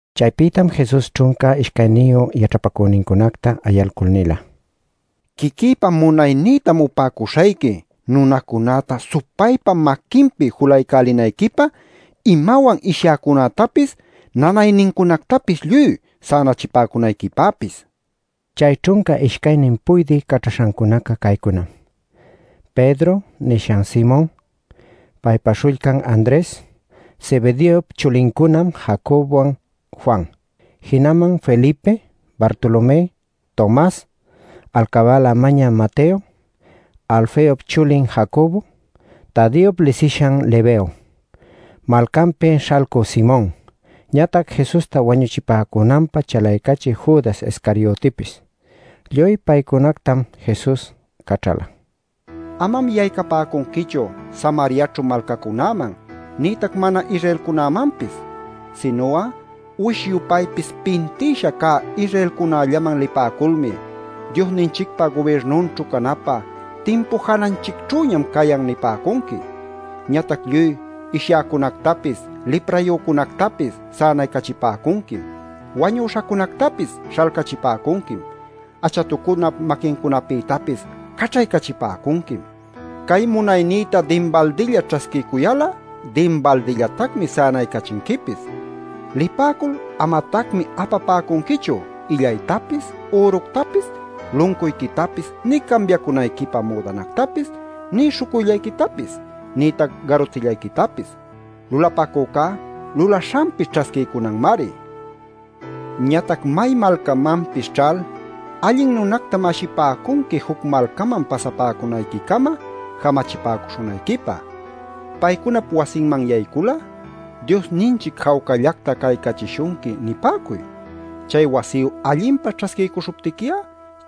Chaypïtam Jesus ćhunca ishcayniyu yaćhapacünincunacta ayalcul nila: “Quiquïpa munaynïtam upäcuśhayqui nunacunäta supaypa maquinpi julaycälinayquipä, imawan ishyäcunätapis nanaynincunactapis lluy sänachipäcunayquipäpis” nil. Chay ćhunca ishcaynin puydï caćhaśhancuna caycunam: “Pedro” nishan Simon, paypa śhullcan Andres, Zebedeop chulincuna Jacobowan Juan. Jinaman Felipe, Bartolomé, Tomas, alcabäla mañä Mateo, Alfeop chulin Jacobo, Tadeop lisishan Lebeo, malcanpi śhalcü Simon, ñatac Jesusta wañuchipäcunanpä chalaycachï Judas Iscariotipis. Lluy paycunactam Jesus caćhala: “Amam yaycapäcunquichu Samariaćhu malcacunäman nïtac mana-Israelcunämanpis. Sinu'a uwish-yupaypis pintïsha cä Israelcunällaman lipäculmi ‘Diosninchicpa gubirnunćhu canapä timpu jananchicćhüñam cayan’ nipäcunqui. Ñatac lluy ishyäcunactapis, liprayücunactapis sänaycachipäcunquim. Wañüśhacunactapis śhalcachipäcunquim. Achatucunap maquincunapïtapis caćhaycachipäcunquim. Cay munaynïta dinbaldilla ćhasquiycuyal'a dinbaldillatacmi sänaycachinquipis. Lipäcul amatacmi apapäcunquichu illaytapis, üructapis, luncuyquitapis nï cambiacunayquipä müdanactapis nï śhucuyllayquitapis, nïtac garutillayquitapis. Lulapacücá lulaśhanpi ćhasquiycunanmari. “Ñatac may malcamanpis ćhal, allin nunactam ashipäcunqui juc malcaman pasapäcunayquicama jamachipäcuśhunayquipä. Paycunap wasinman yaycul'a ‘Diosninchic jawcallacta caycachishunqui’ nipäcuy. Chay wasiyu allinpa ćhasquiycuśhuptiqui'a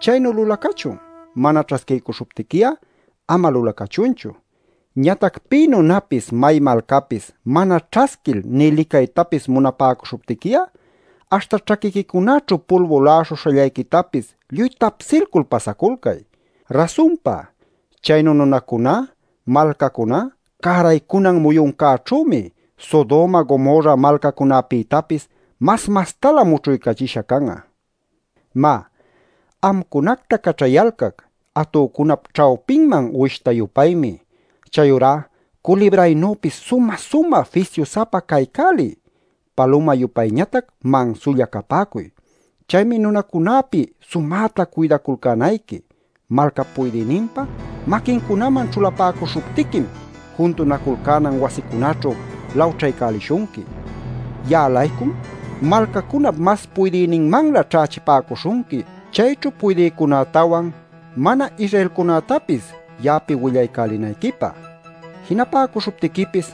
chaynu lulacachun. Mana ćhasquiycuśhuptiqui'a ama lulacachunchu. Ñatac pï nunapis, may malcapis mana ćhasquil nï licaytapis munapäcuśhuptiqui'a aśhta ćhaquiquicunaćhu pulbu la'aśhuśhallayquitapis lluy tapsilcul pasaculcay. Rasunpa, chaynu nunacuná, malcacuná cäraycunan muyuncäćhümi Sodoma, Gomorra malcacunapïtapis mas mastalä mućhuycachisha can'a. “Má, amcunacta caćhayalcac atücunap ćhawpinman uwishta-yupaymi. Chayurá culibraynüpis sumä-sumä fisyu-sapa caycäliy. Paluma-yupayñatac mansulla capäcuy. “Chaymi nunacunäpi sumäta cuydaculcänayqui. Malcap puydïninpa maquincunaman ćhulapäcuśhuptiquim juntunaculcänan wasicunäćhu lawćhaycälishunqui. Ya'a-laycum malcacunap mas puydïninmanlä ćhächipäcuśhunqui, chayćhu puydïcunätawan mana-Israelcunätapis ya'api willaycälinayquipä. Jinapäcuśhuptiquipis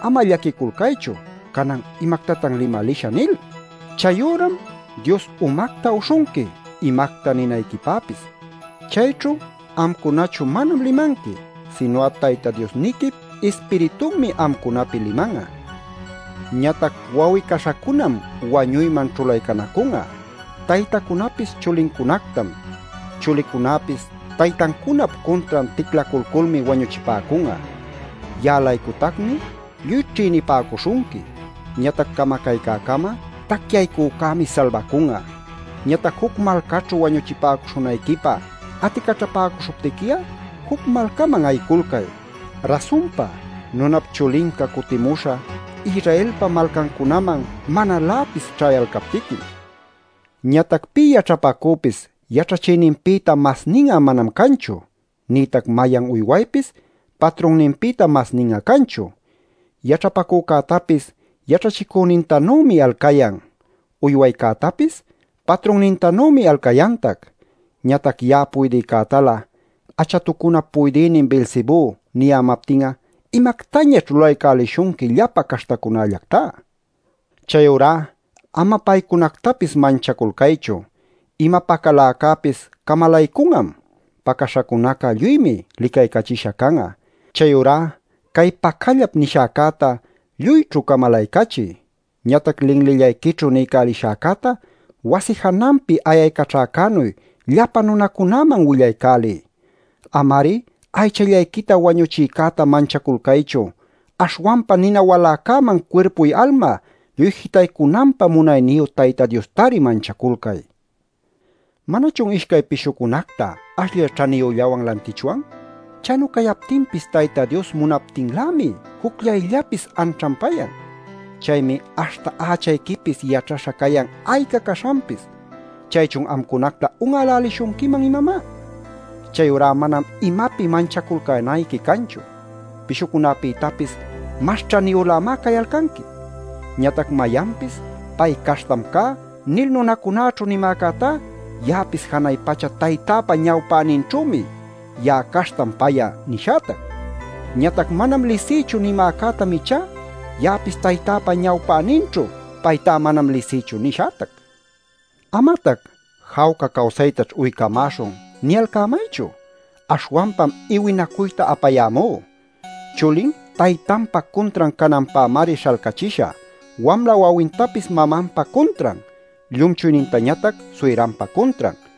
ama llaquiculcaychu ‘canan ¿imactatan limalishä?’ nil. Chay üram Dios umacta uśhunqui, imacta ninayquipäpis. Chayćhu amcunachu manam limanqui, sinu'a Tayta Diosniquip Ispiritunmi amcunapi liman'a. “Ñatac wawi-caśhacunam wañuyman ćhulaycanacun'a. Taytacunapis chulincunactam. Chulicunapis taytancunap cuntran ticlaculculmi wañuchipäcun'a. Ya'a-laycutacmi lluy ćhïnipäcuśhunqui. Ñatac camacaycäcama tacyaycücämi salbacun'a. Ñatac juc malcaćhu wañuchipäcuśhunayquipä aticaćhapäcuśhuptiqui'a, juc malcaman ayiculcay. Rasunpa, Nunap Chulinca cutimuśhä Israelpa malcancunaman manaläpis ćhayalcaptiquim. Ñatac pï yaćhapacüpis yaćhachïninpïta masnin'a manam canchu, nïtac mayan uywaypis patrunninpïta masnin'a canchu. Yaćhapacücätapis yaćhachicünintanümi alcayan. Uywaycätapis patrunnintanümi alcayantac. Ñatac ya'a puydïcätalä ‘achatucunap puydïnin Beelzebú’ niyämaptin'a ¿imactañaćh lulaycälishunqui llapa caśhtäcunallactá? “Chayurá ama paycunactapis manchaculcaychu. Ima pacaläcäpis camalaycun'am. Pacaśhacunaca lluymi licaycachisha can'a. Chayurá cay pacallap nishäcäta lluyćhu camalaycachiy. Ñatac linlillayquićhu niycälishäcäta wasi jananpi ayaycaćhäcänuy llapa nunacunäman willaycäliy. Ama-ari aychallayquita wañuchïcäta manchaculcaychu. Aśhwanpa nina waläcäman cuirpuy-alma lluy jitaycunanpä munayniyu Tayta Diostari manchaculcay. “¿Manachun ishcay pishucunacta ashllay ćhaniyüllawan lantichwan? Chaynu cayaptinpis Tayta Dios munaptinlämi jucllayllapis anćhanpayan. Chaymi aśhta ächayquipis yaćhaśha cayan ayca caśhanpis. ¿Chaychun amcunacta un'älälishunquiman, imamá? Chayurá manam imapi manchaculcänayqui canchu. Pishucunapïtapis mas ćhaniyülämá cayalcanqui. “Ñatac mayanpis: ‘Pay caśhtam cá’ nil nunacunäćhu nimäcätá, ya'apis janay pacha Taytäpa ñawpäninćhümi ‘Ya'a caśhtam pay'a’ nishätac. Ñatac ‘Manam lisïchu’ nimäcätam ichá, ya'apis Taytäpa ñawpäninćhu ‘Paytá manam lisïchu’ nishätac. “Amatac ‘jawca cawsaytaćh uycamäśhun’ niyalcämaychu; aśhwanpam iwinacuyta apayämú. Chulin taytanpa cuntran cananpämari śhalcachishä, wamla wawintapis mamanpa cuntran, llumchuynintañatac suyranpa cuntran.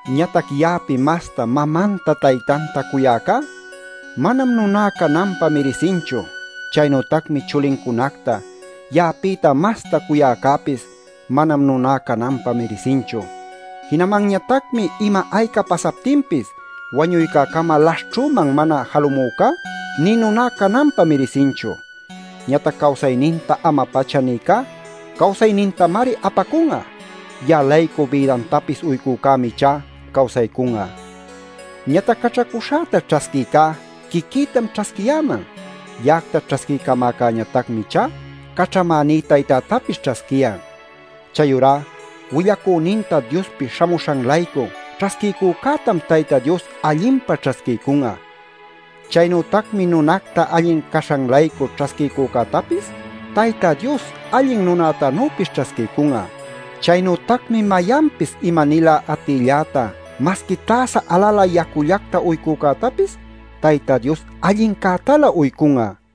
Ñatac ya'api masta mamanta taytanta cuyäcá manam nuná cananpä mirisinchu. Chaynütacmi chulincunacta ya'apïta masta cuyäcäpis manam nuná cananpä mirisinchu. Jinamanñatacmi ima-ayca pasaptinpis wañuycäcama laśhćhüman mana jalumücá nï nuná cananpä mirisinchu. Ñatac cawsayninta ama-pacha nïcá cawsaynintamari apacun'a. Ya'a-laycu bïdantapis uycücämi ichá cawsaycun'a. “Ñatac caćhacuśhäta ćhasquïcá quiquïtam ćhasquiyäman; ya'acta ćhasquiycamäcäñatacmi ichá caćhamäní Taytätapis ćhasquiyan. Chayurá willacüninta Diospi śhamuśhan-laycu ćhasquiycücätam Tayta Dios allinpa ćhasquiycun'a. Chaynütacmi nunacta allin caśhan-laycu ćhasquiycücätapis Tayta Dios allin nunätanüpis ćhasquiycun'a. Chaynütacmi mayanpis ima-nilä atïlläta masqui täsa alalä yacullacta uycücätapis Tayta Dios allincätalä uycun'a” nil.